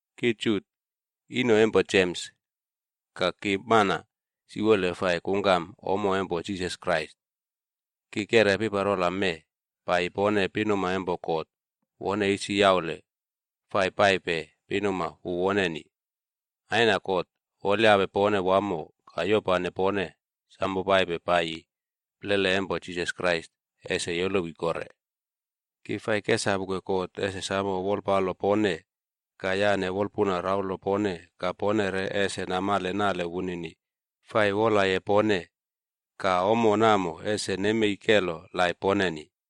Ki Jut, ino empo Jems ka ki mana siwole fai kungkam ommo empo Jisas Krais. Ki keꞌre piparola mee paiyi pone pinuma empo God wone isi yaule fai paipe pinuma wu woneni. Aina God wolyape pone wamo ka yopane pone samo paipe paiyi plele empo Jisas Krais ese yolowi kore. Ki fai kesapuke God ese samo wolpalo pone ka yane wolpuna raulo pone ka pone re ese namale nale wunini fai wolaye pone. Ka ommo namo ese nemei kelo laip poneni.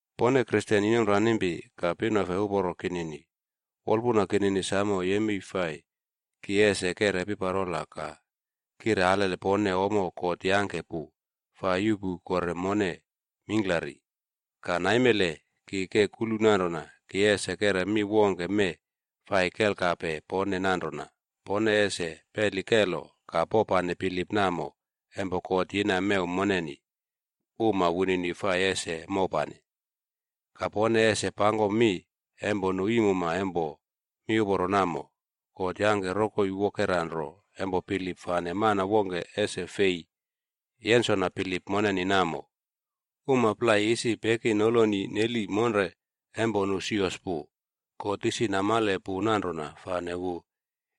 Pone Kristen inomranimpi ka pinofe uporo kinini, wolpuna kinini samo yemei fai ki ese keꞌre piparola ka kire alele pone ommo God yangke pu fai yuꞌpu kore mone mingklari. Ka naimele, ki ke kulu nanrona ki ese keꞌre mi wongke mee fai kelkape pone nanrona, pone ese peli kelo ka popane bilip namo empo God yina mew moneni uma wunini fai ese mopane. Ka pone ese pangkom mi empo nu iimuma empo miuporo namo. God yangke rokoi wokera nro empo bilip fane mana wongke ese fei yensona bilip moneni namo. Uma plai isi peki noloni neli monre empo nu sios pu. God isi namale pu nanrona fane wu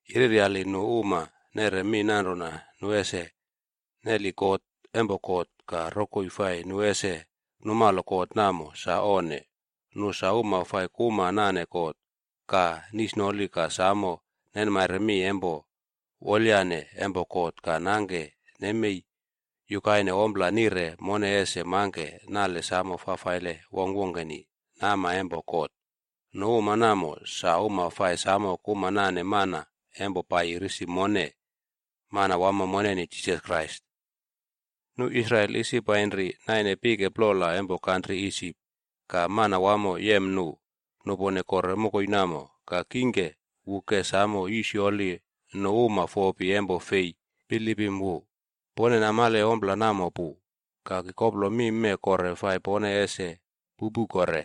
yereryali nu uma neꞌre mi nanrona nu ese neli kot empo God ka rokoi fai nu ese numalo kot namo sa onne. Nu sa uma fai kuma nane God ka nisnoli ka samo nenmaire mi empo wolyane empo God ka nangke nemei yukaine ompla nire mone ese mangke nale samo fafaile wongkwongkeni nama empo God. Nu uma namo, sa uma fai samo kuma nane mana empo paiyi risi mone, Manawamo moneni Jisas Krais. Nu Israel isi painri naine pike plola empo kantri Isip ka Manawamo yem nu nupone kore mokoi namo. Ka kingke, wu ke samo yisyoli nu uma fopi empo fei bilipim wu.a Pone namale ompla namo pu. Ka ki koplo mi mee kore fai pone ese pupu kore.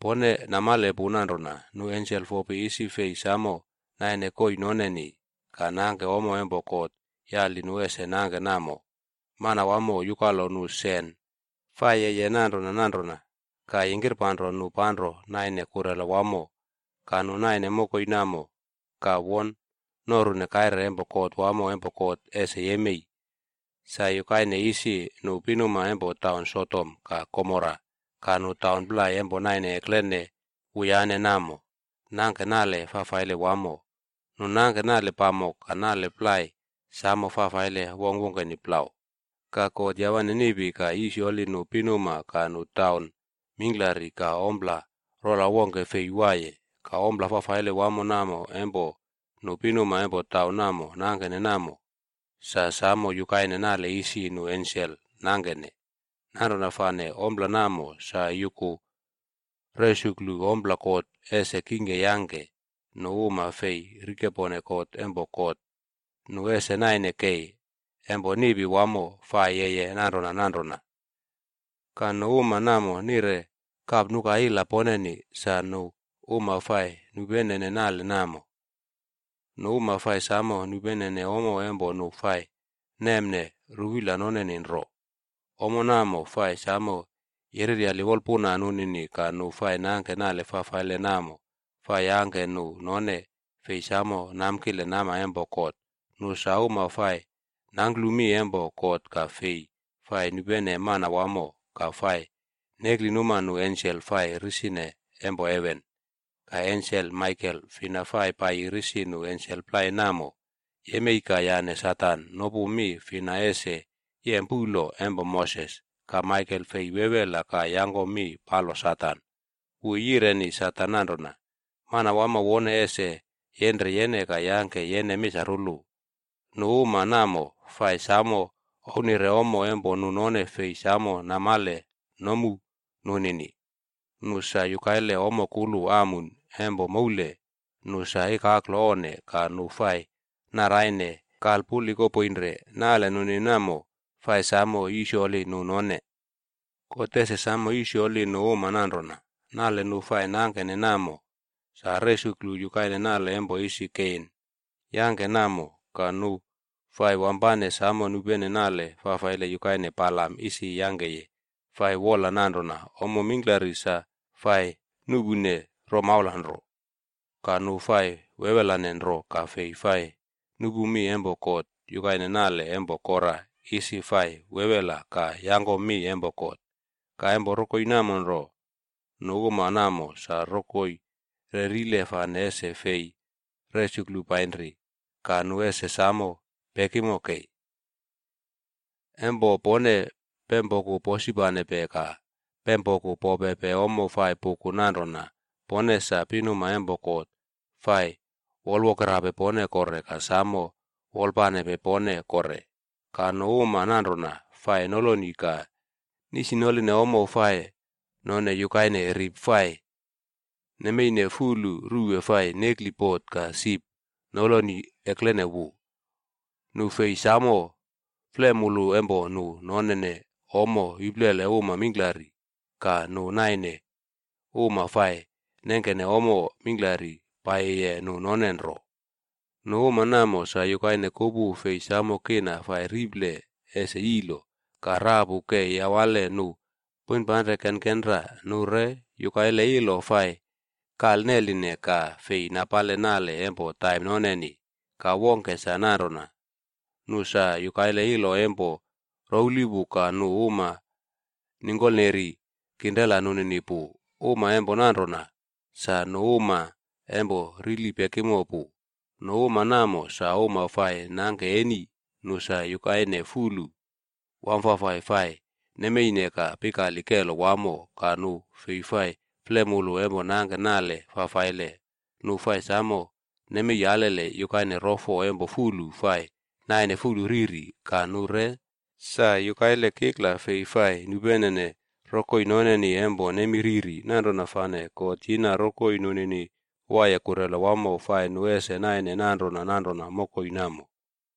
Pone namale pu nanrona nu ensel fopi isi fei samo naine koii nonenib ka nangke ommo empo God yali nu ese nangke namo, Manawamo yukalo nu sen fai yeye nanrona nanrona ka yingkirpanro nu panro naine kurela wamo. Ka nu naine mokoi namo ka won norune kaire empo kot wamo empo God ese yemei. Sa yukaine isi, nu pinuma empo taun Sodom ka Gomora ka nu taun plai empo naine eklene wuyane namo, nangke nale fafaile wamo. Nu nangke nale pamok ka nale plai samo fafaile wongkwongkeni plau. Ka God yawane niꞌpi ka yisyoli nu pinuma ka nu taun mingklari ka ompla rola wongke fei waiye. Ka ompla fafaile wamo namo empo nu pinuma empo taun namo nangkene namo, sa samo yukaine nale isi nu ensel nangkene. Nanrona fane ompla namo sa yuku resuklu ompla God ese kingke yangke nu uma fei rikepone kot empo God, nu ese naine kei empo niꞌpi wamo fai yeye nanrona nanrona. Ka nu uma namo nire kapnuka ila poneni, sa nu uma fai nupenene nale namo. Nu uma fai samo nupenene ommo empo nu fai nemne ruwila noneni nro, ommo namo fai samo yereryali wolpuna nunini ka nu fai nangke nale fafaile namo fai yangke nu none fei samo namkile nama empo God. Nu sa uma fai nangklu mi empo God ka fei fai nupene Manawamo ka fai neklinuma nu ensel fai risine empo heven. Ka ensel Maikel fina fai paiyi risi nu ensel plai namo, yemei ka yane Satan nopu mi fina ese yem puꞌlo empo Moses. Ka Maikel fei wewela ka yangko mi palo Satan. Wu yireni Satan nanrona, “Manawamo wone ese yenre yene ka yangke yene misarulu.” Nu uma namo fai samo ouwnire ommo empo nu none fei samo namale nomu nunini. Nu sa yukaile ommo kulu amun empo moule nu sa ikaklo onne ka nu fai naraine kalpulikopoinre. Nale nunini namo, fai samo yisyoli nu none. God ese samo yisyoli nu uma nanrona. Nale nu fai nangkene namo, sa resuklu yukaine nale empo isi Kein yangke namo.c Ka nu fai wampane samo nupene nale fafaile yukaine Balamd isi yangkeye fai wola nanrona ommo mingklari sa fai nuꞌpune romaula nro. Ka nu fai wewelane nro ka fei fai nupu mi empo God yukaine nale empo Kora isi fai wewela ka yangkom mi empo God.e Ka empo rokoi namo nro, nu uma namo sa rokoi rerile fane ese fei resuklu painri, ka nu ese samo pekimo kei. Empo pone pempoku posipanpe ka pempoku popepe ommo, sa fai puku nanrona pone sa pinuma empo God fai wolwokerape pone kore ka samo wolapanepe pone kore. Ka nu uma nanrona fai noloni ka nisinoline ommo fai none yukaine rip fai nemeine fulu ruwe fai nekli bot ka sip noloni eklene wu.f Nu fei samo flemulu empo nu nonene ommo iplele uma mingklari ka nu naine uma fai nengkene ommo mingklari paiyiye nu none nro. Nu uma namo sa yukaine kupu fei samo kina fai riple ese yilo, ka rapu ke yawale nu poinpanre kenkenra. Nu re yukaile ilo fai kalneline ka fei napale nale empo taim noneni. Ka wongke sa nanrona, nu sa yukaile ilo empo rouwli pu ka nu uma ningkolneri kinrela nunini pu. Uma empo nanrona, sa nu uma empo rili pekimo pu. Nu uma namo sa uma fai nangke eni. Nu sa yukaine fulu wamfafai fai nemeine ka pikali kelo wamo. Ka nu fei fai flemulu empo nangke nale fafaile. Nu fai samo nemei alele yukaine rofo empo fulu fai naine fulu riri. Ka nu re sa yukaile kikla fei fai nupenene rokoi noneni empo nemi riri. Nanrona fane God yina mokoi nunini waiye kulrela wamo fai nu ese naine nanrona nanrona mokoi namo.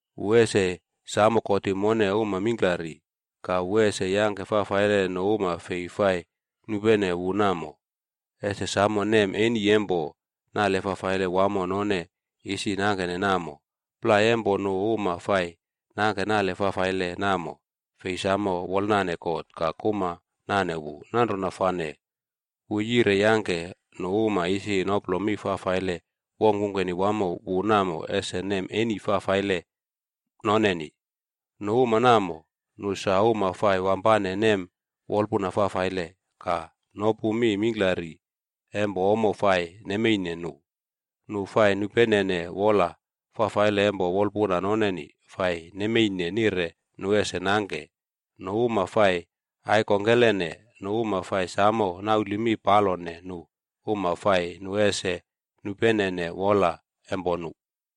Wu ese samo kotim mone uma mingklari. Ka wu ese yangke fafaile nu uma fei fai nupene wu namo, ese samo nem eni empo nale fafaile wamo none isi nangkene namo. Plai empo nu uma fai nangke nale fafaile namo, fei samo wolanane God ka kuma nane wu. Nanrona fane, wu yire yangke nu uma isi noplo mi fafaile wongkwongkeni wamo wu namo ese nem eni fafaile noneni.g” Nu uma namo, nu sa uma fai wampane nem wolpuna fafaile, ka nopu mi mingklari empo ommo fai nemeine nu. Nu fai nupenene wola fafaile empo wolpuna noneni fai nemeine nire nu ese nangke. Nu uma fai aikongkelene. Nu uma fai samo nauli mi palone nu uma fai nu ese nupenene wola empo nu.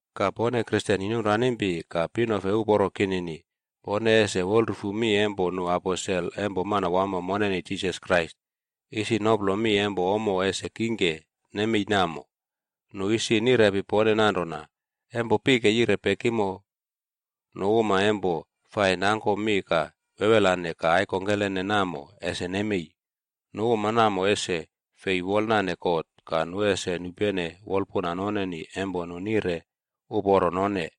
Ka pone Kristen inomranimpi ka pinofe uporo kinini, pone ese wolrufu mi empo nu aposel empo Manawamo moneni Jisas Krais isi noplo mi empo ommo ese kingke nemei namo. Nu isi nirepi pone nanrona, “Empo pike yire pekimo, nu uma empo fai nangkom mi ka wewelane ka aikongkelene namo, ese nemei. Nu uma namo ese fei wolnane God ka nu ese nupene wolpuna noneni empo nu nire uporo none.”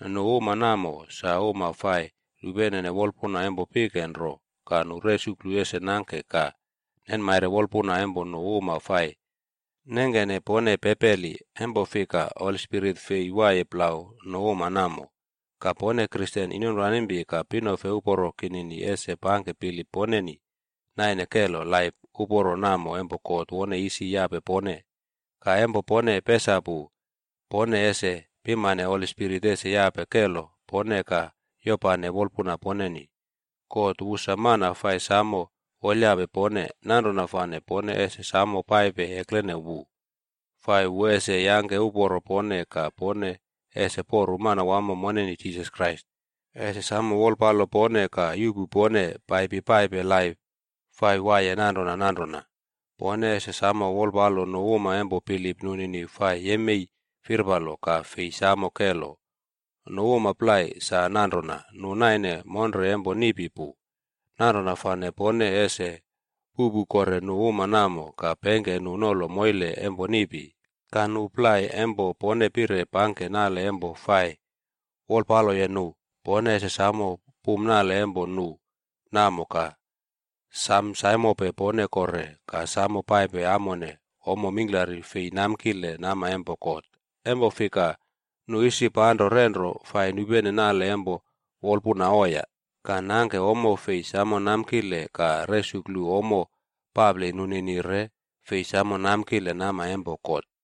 Nu uma namo, sa uma fai nupenene wolpuna empo pike nro ka nu resuklu ese nengke ka nenmaire wolpuna empo nu uma fai nengkene pone pepeli. Empo fika, Holi Spirit fei waiye plau nu uma namo. Ka pone Kristen inomranimpi ka pinofe uporo kinini ese pangke bilip poneni naine kelo laip uporo namo empo God wone isi yape pone. Ka empo pone pesapu, pone ese pimane Holi Spirit ese yape kelo pone ka yopane wolpuna poneni. God wu sa mana fai samo wolyape pone. Nanrona fane pone ese samo paipe eklene wu, fai wu ese yangke uporo pone ka pone ese poru Manawamo moneni Jisas Krais ese samo wolpalo pone ka yuꞌpu pone paipi paipe laip fai waiye nanrona nanrona. Pone ese samo wolpalo nu uma empo bilip nunini fai yemei firpalo ka fei samo kelo. Nu uma plai, sa nanrona nu naine monre empo niꞌpi pu. Nanrona fane pone ese puꞌpu kore nu uma namo ka pengke nu nolo moile empo niꞌpi. Ka nu plai, empo pone pire pangke nale empo fai wolpaloye nu, pone ese samo pum nale empo nu namo ka sam saimope pone kore ka samo paipe amone ommo mingklari fei namkile nama empo God. Empo fika, nu isi panro renro fai nupene nale empo wolpuna oiya ka nangke ommo fei samo namkile ka resuklu ommo papli nunini re fei samo namkile nama empo God.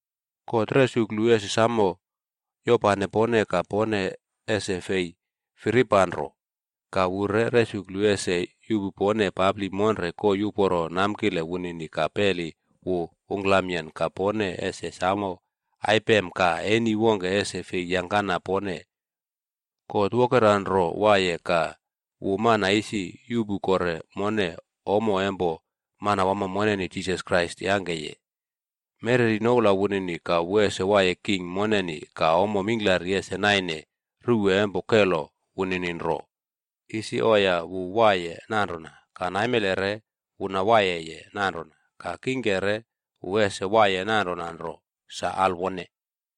God resuklu ese samo yopane pone ka pone ese fei firipanro. Ka wu re resuklu ese yuꞌpu pone papli monre koii uporo namkile wunini ka peli wu ungklamyen ka pone ese samo aipem ka eni wongke ese fei yangkana pone. God wokera nro waiye ka wu mana isi yuꞌpu kore mone ommo empo Manawamo moneni Jisas Krais yangkeye. Mereri noula wunini ka wu ese waiye king moneni ka ommo mingklari ese naine ruwe empo kelo wunini nro. Isi oiya wu waiye nanrona ka naimele re wu nawaiyeye nanrona ka kingke re wu ese waiye nanrona nro. Sa alwone.